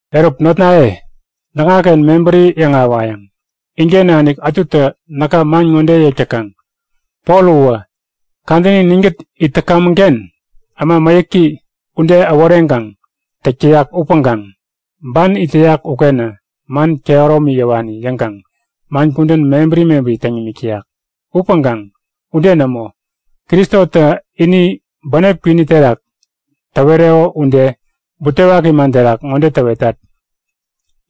Eruk notnaye, näkŋaken mebäri yäŋahäwayäŋ. Inken nanik ätutä näka man ŋode yäk täkaŋ; Pol uwä, kadäni ninkät it täkamäŋ-ken äma mäyäki ude äworeŋkaŋ täk täyak upäŋkaŋ ban it täyak ukenä man kehäromi yäwani yäŋkaŋ man kudän mebäri mebäri täŋ nimik täyak. Upäŋkaŋ ude nämo. Kristotä ini bänep kwini terak täwereko ude butewaki man terak ŋode täwetat;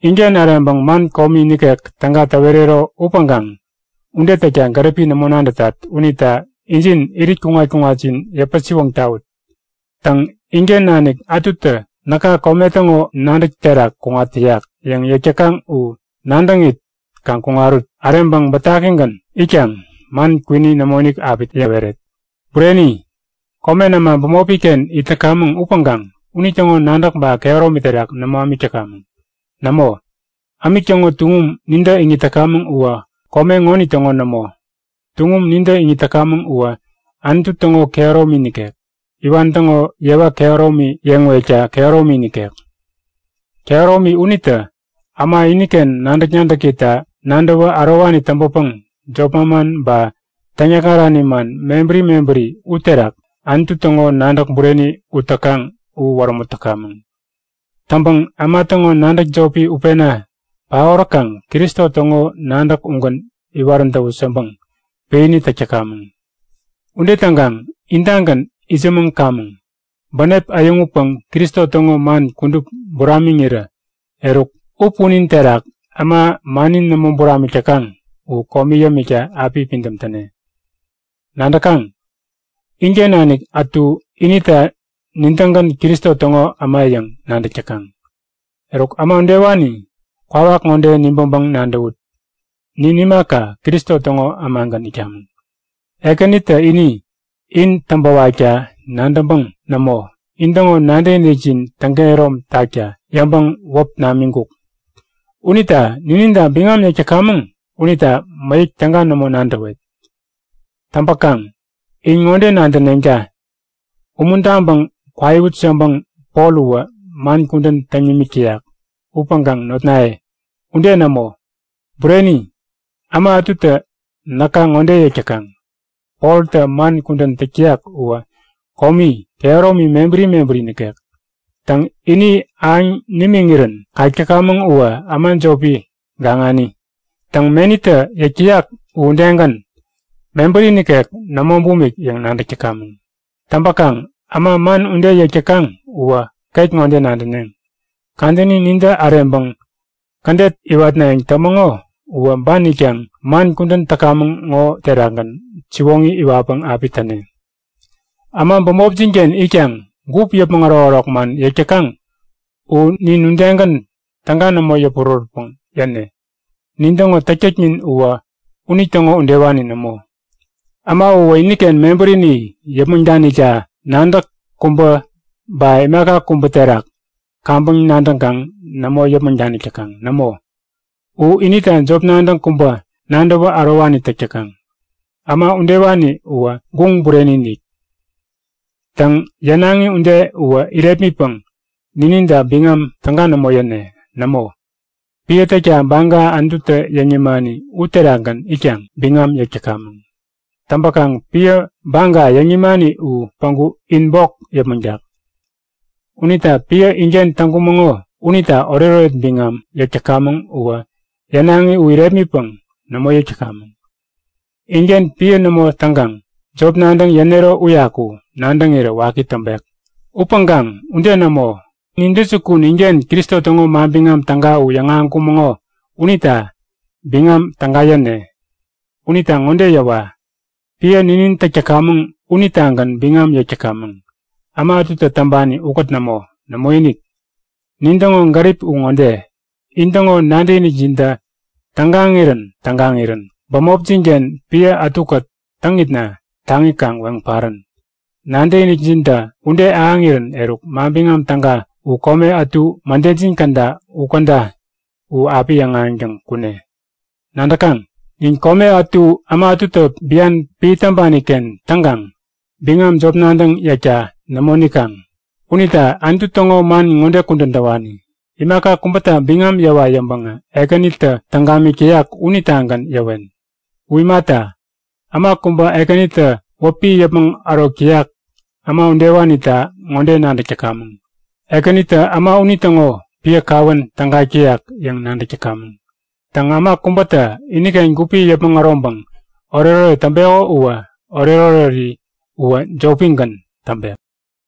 Inken äreŋpäŋ man komi nikek täga täwerero upäŋkaŋ ude täkta gäripi nämo nadätat unita injin irit kuŋat-kuŋatjin yäpä-siwoŋ tawut. Täŋ, inken nanik ätutä näka kome täŋo nadäk terak kuŋat täyak yäŋ yäk täkaŋ u nadäŋit kaŋ kuŋarut. Äreŋpäŋ bätakigän itkaŋ man kwini nämoinik api yäweret. Bureni, komen äma bämopi-ken it täkamäŋ upäŋkaŋ unitäŋo nadäk ba kehäromi terak nämo ämik täkamäŋ. Nämo, ämik täŋo tuŋum nintä iŋit täkamäŋ uwä kome ŋonitäŋo nämo. Tuŋum nintä iŋit täkamäŋ uwä Anutu täŋo kehäromi nikek, iwan täŋo yewa kehäromi yeŋwekta kehäromi nikek. Kehäromi unitä äma iniken nadäk-nadäkita nadäwä ärowani täŋpäpäŋ jop manman ba täŋyäkŋarani man mebäri mebäri uterak Anutu täŋo nadäk bureni ut täkaŋ u wärämut täkamäŋ. Täŋpäŋ äma täŋo nadäk jopi utpena paoräkaŋ Kristo täŋo nadäk ugän iwarän täwut yäŋpäŋ piäni täk täkamäŋ. Ude täŋkaŋ intagän itsämäŋkamäŋ. Bänep äyäŋutpäŋ Kristo täŋo man kudup buramiŋirä, eruk u punin terak äma mannin nämo buramik täkaŋ u komi yämikta api pidäm täne. Nadäkaŋ? Inken nanik ätu inita Nin-tägän Kristo täŋo äma yäŋ nadäk täkaŋ. Eruk, äma udewani, kwawak ŋode nibäŋpäŋ nadäwut; Nin imaka, Kristo täŋo ämagän itkamäŋ. Ekänitä ini in täŋpäwakta nadäŋpäŋ nämo, intäŋo nadäkinikjin täŋkehärom takta yäŋpäŋ wäp namiŋkuk. Unita nininta biŋam yäk täkamäŋ unita mäyäk täga nämo nadäwet. Täŋpäkaŋ in ŋode nadäneŋta; Umuntaŋpäŋ kwaiwut yäŋpäŋ Pol uwä man kudän täŋ nimik täyak. Upäŋkaŋ notnaye, ude nämo! Bureni, äma ätutä näka ŋode yäk täkaŋ; Poltä man kudän täk täyak uwä komi kehäromi mebäri mebäri nikek. Täŋ, ini ahäŋ nimiŋirän kak täkamäŋ uwä äma jopi gaŋani. Täŋ, menitä yäk täyak u udegän, mebäri nikek nämo bumik yäŋ nadäk täkamäŋ. Täŋpäkaŋ äma man ude yäk täkaŋ uwä ket ŋode nadäneŋ; Kadäni nintä äreŋpäŋ kädet iwatnayäŋ tämäŋo uwä ban itkaŋ man kudän täkamäŋ ŋo terakgän siwoŋi iwatpäŋ api täne. Äma bämopjin-ken itkaŋ gup yäpmäŋ ärokärok man yäk täkaŋ u nin udegän täga nämo yäpurärätpäŋ yäne. Nin täŋo täktäknin uwä unitäŋo udewani nämo. Äma uwä iniken mebärini yäpmäŋ danikta nadäk kubä ba imaka kubä terak kaŋpäŋ nadäŋkaŋ nämo yäpmäŋ danik täkaŋ. Nämo, u inita jop nadäŋ kubä nadäwä ärowani täk täkaŋ. Äma udewani uwä guŋ bureni-inik! Täŋ, yänaŋi ude uwä irepmitpäŋ nininta biŋam täga nämo yäne. Nämo, piä täkta baga Anututä yäŋ nimani uterakgän itkaŋ biŋam yäk täkamäŋ. Täŋpäkaŋ piä baga yäŋ nimani u päŋku in bok yäpmäŋtak. Unita piä inken täŋkumäŋo unita oretoret biŋam yäk täkamäŋ uwä yänaŋi u irepmitpäŋ nämo yäk täkamäŋ. Inken piä nämo täŋkaŋ, jop nadäŋ yänero uyaku nadäŋirä waki täŋpek. Upäŋkaŋ ude nämo, nintäjukun inken Kristo täŋo Manbiŋam Täga u yäŋahäŋkumäŋo unita biŋam täga yäne. Unita ŋode yäwa; Piä ninin täk täkamäŋ unitagän biŋam yäk täkamäŋ. Äma ätutä täŋpani ukät nämo. Nämoinik. Nintäŋo gärip u ŋode; In täŋo nadäkinikjintä tägaŋirän-tägaŋirän bämopjin-ken piä ätukät täŋitna taŋi kaŋ weŋ parän. Nadäkinikjintä ude ahäŋirän eruk Manbiŋam Täga u kome ätu mädejin käda u käda u api yäŋahäŋtäŋ kune. Nadäkaŋ? Nin kome ätu äma ätutä bian piä täŋpani-ken täŋkaŋ biŋam jop nadäŋ yäkta nämo nikaŋ. Unita Anutu täŋo man ŋode kudän täwani; Imaka kubäta biŋam yäwa yäŋpäŋä Ekänitä täŋ gamik täyak unitagän yäwen. U imata, äma kubä Ekänitä wäpi yäpmäŋ ärok täyak, äma udewanita ŋode nadäk täkamäŋ; Ekänitä äma unitäŋo piä kawän tägak täyak yäŋ nadäk täkamäŋ. Täŋ, äma kubätä iniken gupi yäpmäŋ äroŋpäŋ oretoret täŋpeko uwä oretoreri uwä jopigän täŋpek.